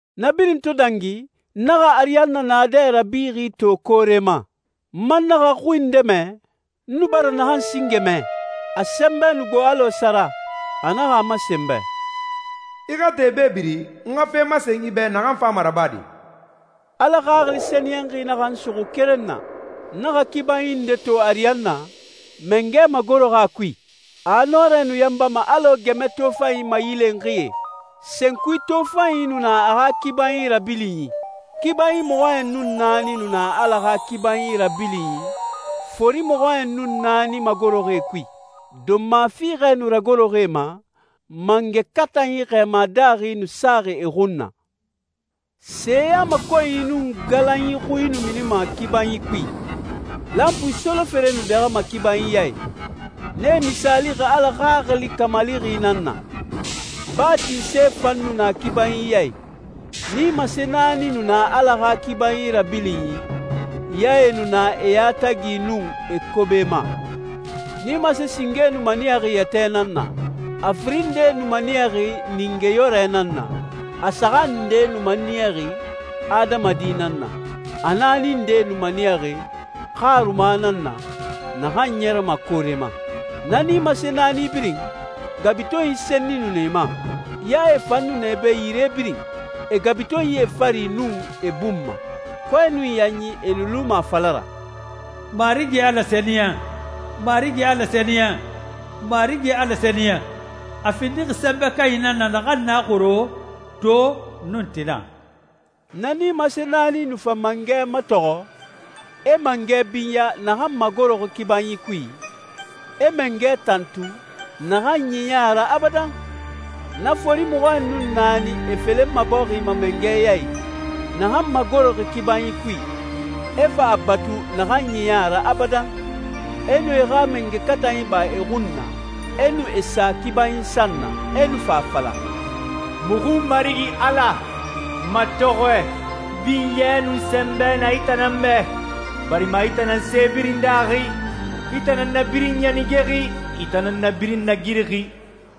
Na birin to dangi, n naxa ariyanna naadɛ rabixi to koore ma. N man naxa xui nde mɛ, n nu bara naxan singe mɛ. A sɛnbɛ nu gbo alɔ sara. A naxa a masen n bɛ, «I xa te bebiri, n xa fe masen i bɛ naxan fama rabade.» Ala Xaxili Sɛniyɛnxi naxa n suxu keren na. N naxa kibanyi nde to ariyanna, mangɛ magoroxi a kui. A nɔrɛ nu yanbama alɔ gɛmɛ tofanyi mayilenxie, senkui tofanyi nu na a xa kibanyi rabilinyi. Kibanyi mɔxɔɲɛn nun naani nu na Ala xa kibanyi rabilinyi, fori mɔxɔɲɛn nun naani magoroxi e kui. Donma fiixɛ nu ragoroxi e ma, mangɛ katanyi xɛɛma daaxi nu saxi e xun na. Seyamakɔnyi nun galanyi xuie nu minima kibanyi kui. Lanpui solofere nu dɛxɛma kibanyi ya i. Nee misaalixi Ala Xaxili kamalixi nan na. Baa tinse fan nu na kibanyi ya i. Nimase naani nu na Ala xa kibanyi rabilinyi, yae nu na e yatagi nun e kobe ma. Nimase singe nu maniyaxi yɛtɛ nan na, a firin nde nu maniyaxi ningeyɔrɛ nan na, a saxan nde nu maniyaxi adamadi nan na, a naani nde nu maniyaxi xaruma nan na, naxan ɲɛrɛma koore ma. Na nimase naani birin, gabutenyi senni nu na e ma. Yae fan nu na e bɛ yire birin, e gabutenyie fari nun e bun ma. Kɔɛ nun yanyi e nu luma a fala ra, «Marigi Ala sɛniyɛn, Marigi Ala sɛniyɛn, Marigi Ala sɛniyɛn. A findixi Sɛnbɛ Kanyi nan na naxan na xoro, to, nun tina.» Na nimase naani nu fa Mangɛ matɔxɔ, e mangɛ binya naxan magoroxi kibanyi kui, e mangɛ tantu, naxan ɲiɲɛ a ra abadan, na fori mɔxɔɲɛn nun naani, e felenma bɔxi ma Mangɛ ya i, naxan magoroxi kibanyi kui, e fa a batu naxan ɲiɲɛ a ra abadan. E nu e xa mangɛ katanyi ba e xun na, e nu e sa kibanyi san na, e nu fa a fala, «Muxu Marigi Ala, matɔxɔɛ, binyɛ, nun sɛnbɛ na i tan nan bɛ, barima i tan nan se birin daaxi, i tan nan na birin ɲanigexi, i tan nan na birin nagirixi.»